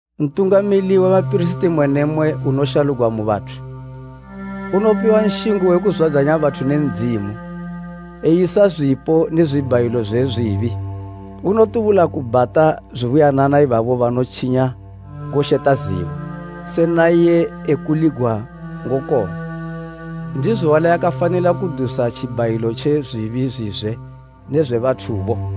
Ntungamili we bapirisiti mmwe ne mmwe unoshalugwa mu bathu unopiwa nshingo we kuzwadzanya bathu ne Ndzimu, eyisa zwipo ne zwibhayilo zwe zwibi. Unotubula kubhata zubuyanana ibabo banotjinya ngosheta zibo, se naiye ekuligwa ngokong'wa. Ndizo wali akafanila kudusa tjibhayilo tje zwibi zwizwe ne zwe bathubo.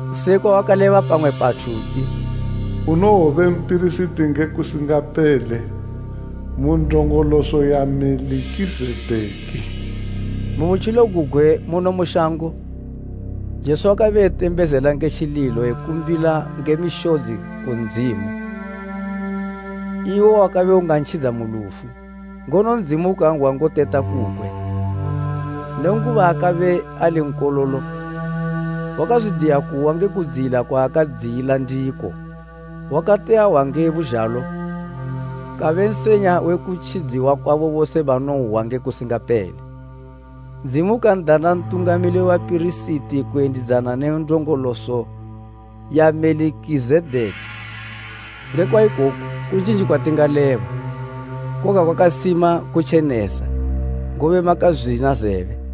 Sekwa wakaleba pamwe pathu uti, “Unowobe mpirisiti nge kusingapele, mu ndongoloso ya Melikizedeki.” Mu butjilo gugwe muno mu shango, Jesu wakabe etembezela nge tjililo ekumbila nge mishodzi, ku Ndzimu iwo wakabe ungantjidza mu lufu. Ngono Ndzimu ukan'hwa ngoteta kukwe. Nenguba akabe ali Nkololo, wakazwidiya kuhwa nge kudziyila kwaakadziyila ndiko. Wakati ahwa nge buzhalo, kabe nsenya we kutjidziwa kusingapele kwabo bose banonhwa. Ndzimu ukan'dana Ntungamili we bapirisiti kuyendidzana ne ndongoloso ya Melikizedeki. Nge kwaikoku kunjinji kwatingaleba, koga kwakasima kutjenesa, ngobe makazwina zebe.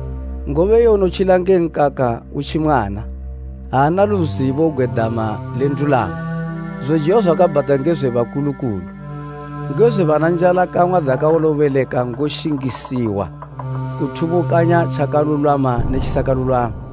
Ngobe iye unotjila nge nkaka utji mwana, aana luzibo gwe dama le ndulamo. Zojiwa zwakabhata nge zwe bakulukulu, nge zwe bana njalakang'wa dzakawolobeleka ngoshingisiwa kuthubukanya tjakalulwama ne tjisakalulwama.